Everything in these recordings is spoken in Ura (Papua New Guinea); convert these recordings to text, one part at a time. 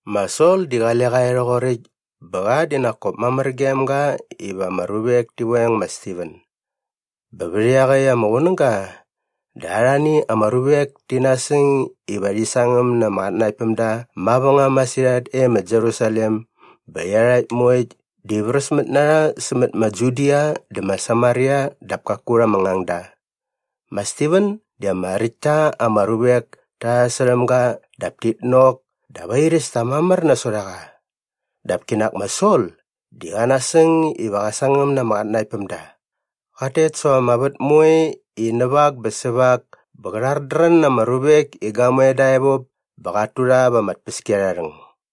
Ma Sol di qale qa e rhoqoräkt bä qa di nak kop mamär gem ga iva ama ruvek ti veng ma Stiven. Bä vät iaqäkt ama qunäga dä arhani ama ruvek ti nasäng iva rhi sangäm na ama qatnanaktpämda mavängam masirhat e ma Jerusalem bä iarhakt moekt di vräsmät na rha sämät ma Judia dä ma Samaria dap kaku rha ama ngangda. Ma Stiven di ama räkt ta ama ruvek ta sasärhäm ga dap tit nok dap airäs ta mamär nasot a qa. Dap kinak ma Sol di qa nasäng iva qä sangäm na ama qatnanaktpämda. Qat tet säva ama vät moe i näva ak bä säva ak bä qä rhardrän na ama ruvek i gamoe dä evop bä qat tu rha va ama tpäskiarharhäng.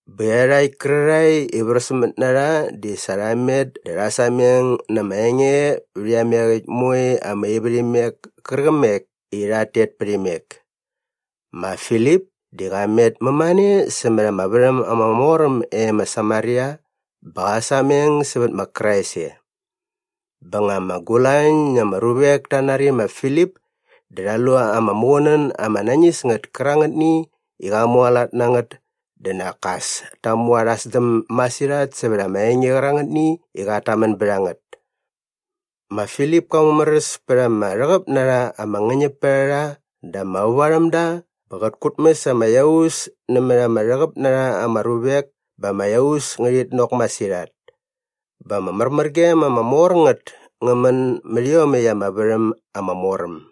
Bä iarhakt kärarhae i vräsmät na rha di sa rha met dä rha sameng na ama enge vät iameqäkt moe ama ivärhimek kärqämek i rhat tet pät imek. Ma Filip di qa met mämane sämät ama värhäm ama mor äm e ma Samaria bä qa sameng sävät ma Krais e. Bä nga ama gulañ na ama ruvek ta nari ma Filip dä rha lu ama muqunän ama nañis ngät kärangätni i qa mualat na ngät dä nak as ta mu arha sdäm masirhat sävät ama enge qärangätni i qat tamän bät a ngät. Ma Filip ka mumäräs pät ama rhäqäp na rha ama ngäñäpärharha dä ama vävarhämda bä qät kutmäs ama iaus nämät ama rhäqäp na rha ama ruvek bä ama iaus ngärhit nok masirhat. Bä ama märmärgem ama mor ngät ngä män mät iomäkt ama värhäm ama mor äm.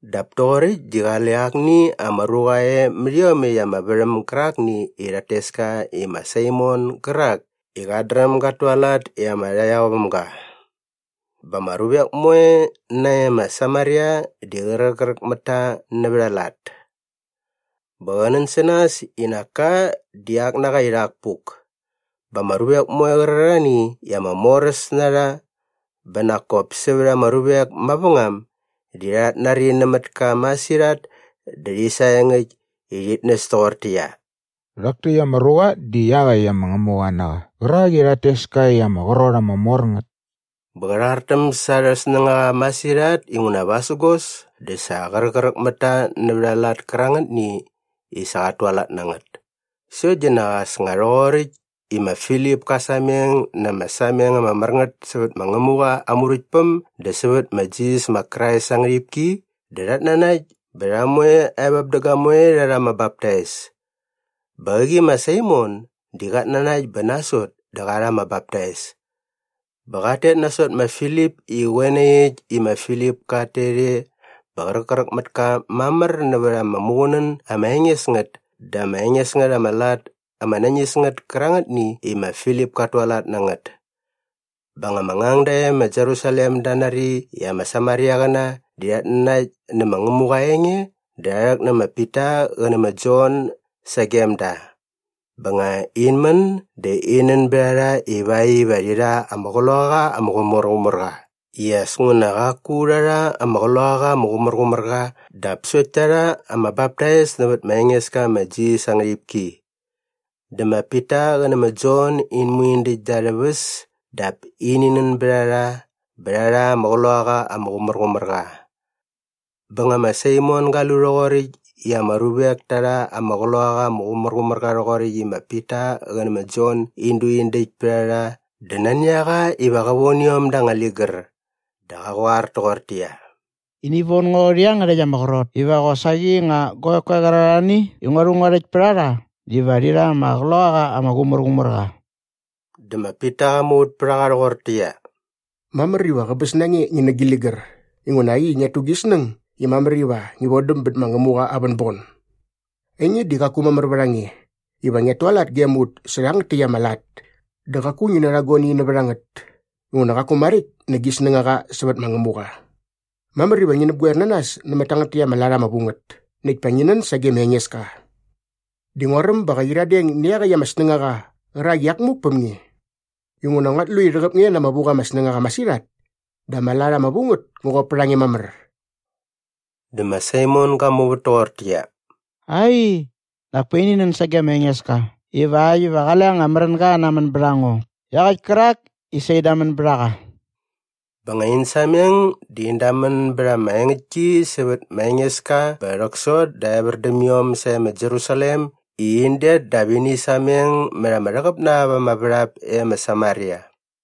Dap toqoräkt di qale akni ama ruqa e mät iomäkt ama värhäm gärakni i rhat tes ka i ma Saimon gärak i qat dräm gat tualat i ama rhaqyaovämga. Bä ama ruvek moe nae ma Samaria di qräqräk mät ta nävät aa lat. Bä qä nän sä nas i nak ka di ak na qa i rhak puk. Bä ama ruvek moe qärarhani i ama moräs na rha bä nak kop sävät ama ruvek mavängam di rhat nari nämät ka masirhat dä rhi saengäkt i rhit näs toqortäqyia, “Rhak täkt ama ruqa di iaqäkt ama ngämuqa na qa qärak i rhat tes ka i Ama Qrot Ama Mor Ngät.” Bä qä rhartäm sa arhä snängaqa masirhat inguna vasägos dä sa qräqräk mät ta nävät ama lat kärangätni i sa qat tualat na ngät. Sokt di nak as nga rhoqoräkt i ma Filip ka sameng na ama sameng ama mär ngät sävät ma Ngämuqa aa Muräktpäm dä sävät ma Jisas ma Krais aa ngärhipki dä rhat nanakt bä rha moe evop dä gamoe rha rha ama baptais. Bä qäqi ma Saimon di qat nanakt bä nasot dä qa rha ama baptais. Bä qat tet nasot ma Filip i qoe nai äkt i ma Filip kat tet e bä qräqräk mät ka mamär nävät ama muqunän ama enges ngät dä ama enges ngät ama lat ama nañis ngät kärangätni i ma Filip kat tualat na ngät. Bä nga ama ngangda e ma Jerusalem da nari i ama Samariaqäna di rhat nanakt nä ma Ngämuqa aa enge dä rha rhäk nä ma Pita qä nä ma Jon sagem da. Bä nga in män dä in nän bät a rha ivakt iva rhi rha ama Qloqaqa ama Qumärqumärqa i as nguna qaku rha rha ama Qloqaqa ama Qumärqumärqa dap sokt ta rha ama baptais nävät ma Engeska ma Jisas aa ngärhipki. Dä ma Pita qä nä ma Jon in mu in däkt da arhä väs dap ini nän bät a rha bä rha rha ama Qloqaqa ama Qumärqumärqa. Bä nga ma Saimon ga lu rhoqoräkt i ama ruvek ta rha ama Qloqaqa ama Qumärqumärqa rhoqoräkt i ma Pita qä nä ma Jon in du in däkt pät a rha dä nani a qa iva qa von iom da anga ligär dä qa qoar toqortäqyia, “Ini von ngo rhä iangärhäkt ama qrot iva qosaqi nga guavek koe qärarhani i ngua rhu ngua rhäkt pät a rha diva rhi rha ama Qloqaqa ama Qumärqumärqa.” Dä ma Pita qa muvät pät a qa rhoqortäqyia, “Mamär iva qäbäs na nge ngi nä gi ligär inguna äkt i ngiat tu gi snäng i mamär iva ngi vodäm bät ma Ngämuqa aa vänbon. Ainge di qaku mamär vät a nge iva ngiat tualat gem ut sä rhangät täkt ama lat dä qaku ngi narha guani nävät a ngät inguna qaku maräkt nä gi snängaqa sävät ma Ngämuqa. Mamär iva ngi näpgoer na nas nämät tangät täkt ama lat ama vu ngät näkt pa ngi nän sage ma Engeska. Di nguaräm ba qä qyiradeng nä iaqäkt ama snängaqa qärak i iak muk päm nge. Inguna nguat lu i rhäqäp nge na ama vu qa ama snängaqa masirhat dä ama lat ama vu ngät ngä qop pät a nge mamär.” Dä ma Saimon ga muvät toqortäqyia, “Ai, nak pa ini nän sage ma Engeska ivakt iva qale anga märänga qä namän bät a ngo iaqäkt kärak i sa in damän bät a qa.” Bä nga in sameng dä in damän bät ama engäktki sävät ma Engeska bä rhäksot dä evär däm iom sae ma Jerusalem i in det dap ini sameng mät ama rhäqäp na ap ama värhap e ma Samaria.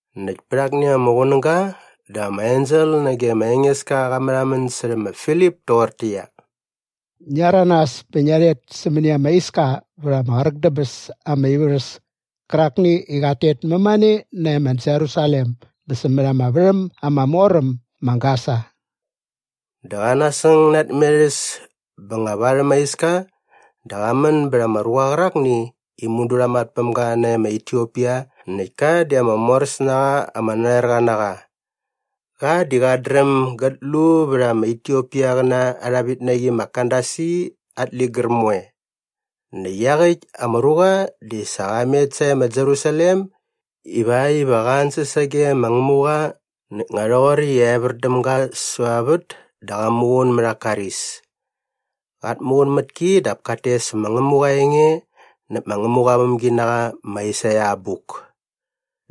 Näkt pät akni ama qunäga dä ama ensel nage ma Engeska qa märhamän särhä ma Filip toqortäqyia, “Ngia rhäranas bä ngia rhet sämäni ama iska vät ama qräk dä bäs ama ivärhäs kärakni i qat tet mämane nae ma Jerusalem bä sämät ama värhäm ama mor äm ma Gasa.” Dä qa nasäng na aa tmerhäs bä nga varhäm aa iska dä qa män bät ama ruqa qärakni i mudu rha mat päm ga nae ma Etiopia näkt ka di ama moräs na qa ama narhoerqa na qa. Qa di qat dräm gät lu vät ama Etiopiaqäna arha vitnaqi ma Kandasi at ligär moe. Näkt iaqäkt ama ruqa di sa qa met sae ma Jerusalem ivakt iva qa ansäs sage ma Ngämuqa näkt nga rhoqoräkt i evär däm ga säva aa vät dä qa muqun mät aa karis. Qat muqun mät ki dap kat tes ma Ngämuqa aa enge näp ma Ngämuqa aa vämginaqa ma Aisaia aa abuk.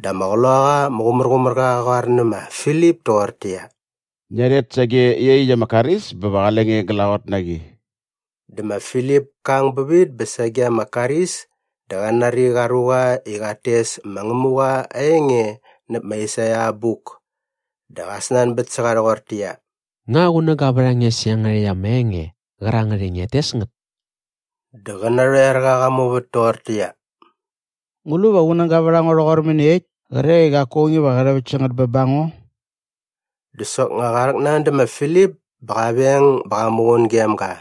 Dä ama Qloqaqa ama Qumärqumärqa qa qoar nä ma Filip toqortäqyia, “Ngia rhet sage iaqyäkt ama karis bä va qale nge glaqot na qi.” Dä ma Filip ka ang bävit bä sage ama karis dä qa nari qa ruqa i qat tes ma Ngämuqa aa enge näp ma Aisaia aa abuk. Dä qa snanbät sä qa rhoqortäqyia, “Nga qunäga vät a nge sä iangärhäkt ama enge qärangät i ngiat tes ngät?” Dä qä narhoerqa qa muvät toqortäqyia, “Ngu lu va qunäga vät a ngo rhoqor mäniekt kre i qaku aung iva qä rhäväkt sä ngät bä ba ngo?” Dä soknga qa rhäknan dä ma Filip bä qa veng bä qa muqun gem ga.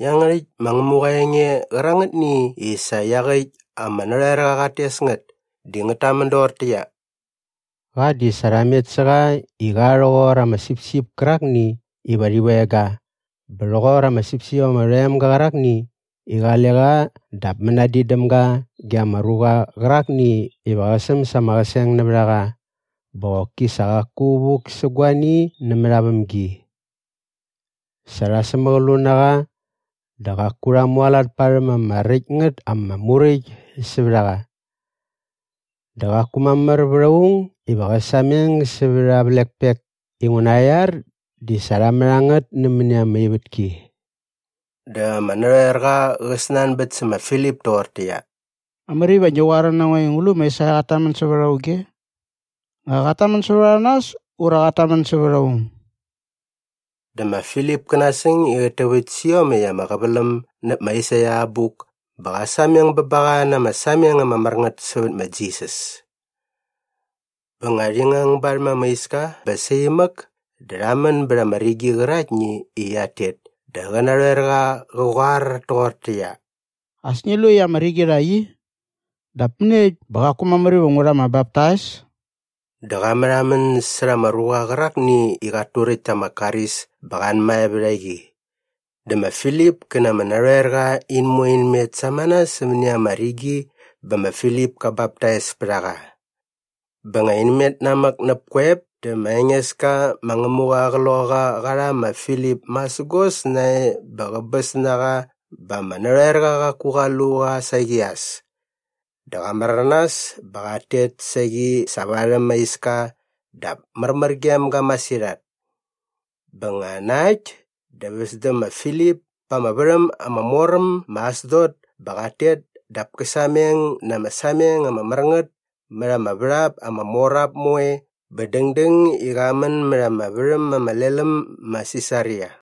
Iangärhäkt ma Ngämuqa aa enge qärangätni i sa iaqäkt ama narhoerqa qat tes ngät di ngät tamän doqortäqyia, “Qa di sa rha met sä qa i qa rhoqor ama sipsip kärakni iva rhi veng ga bä rhoqor ama sipsip ama rhoem ga qärakni i qale qa dap mänadin däm ga ge ama ruqa qärakni iva qä säm sa aa qäseng nävät a qa bä qoki sa qaku vuk sä guani nämät aa vämgi. Sa rha sämäqlu na qa dä qaku rha mualat parhäm ama räkt ngät ama muräkt sävät a qa. Dä qaku mamär vät aung iva qä sameng sävät aa vlekpek inguna aa iar di sa rha mät a ngät nämäni ama ivätki.” Dä ama narhoerqa qä snanbät sä ma Filip toqortäqyia, “Mamär iva ngi qoar na ngo i ngu lu ma Aisaia qat tamän sävät auge? Nga qat tamän sävät a nas ura qat tamän sävät aung?” Dä ma Filip kä nasäng i qät täväkt sä iomäkt ama qäväläm näp ma Aisaia aa abuk bä qa sameng bä ba qa na ama sameng ama mär ngät sävät ma Jisas. Bä nga rhi ngang barhäm ama iska bä saimäk dä rha män bät ama rigi qäraktni i qiat tet dä qä narhoerqa qä qoar toqortäqyia, “As ngi lu i ama rigi rhakt i. Dap mäniekt bä qaku mamär iva ngu rha ama baptais?” Dä qa märhamän särha ama ruqa qärakni i qat turäkt ta ama karis bä qa anmae vät a qi. Dä ma Filip kä na ama narhoerqa in moe in met samana sämäni ama rigi bä ma Filip ka baptais pät a qa. Bä nga in met namäk näp koep dä ma Engeska ma Ngämuqa aa Qloqaqa qa rha ma Filip masägos nae bä qäbäs na qa bä ama narhoerqa qaku qa lu qa saqi as. Dä qa märanas bä qat tet saqi sa varhäm aa iska dap märmär gem ga masirhat. Bä nga na äkt dä väs däm ma Filip pa ama värhäm ama mor äm ma Asdot bä qat tet dap kä sameng na ama sameng ama mär ngät mät ama värhap ama mor ap moe bä dängdäng i qa män mät ama värhäm ama lel äm ma Sisaria.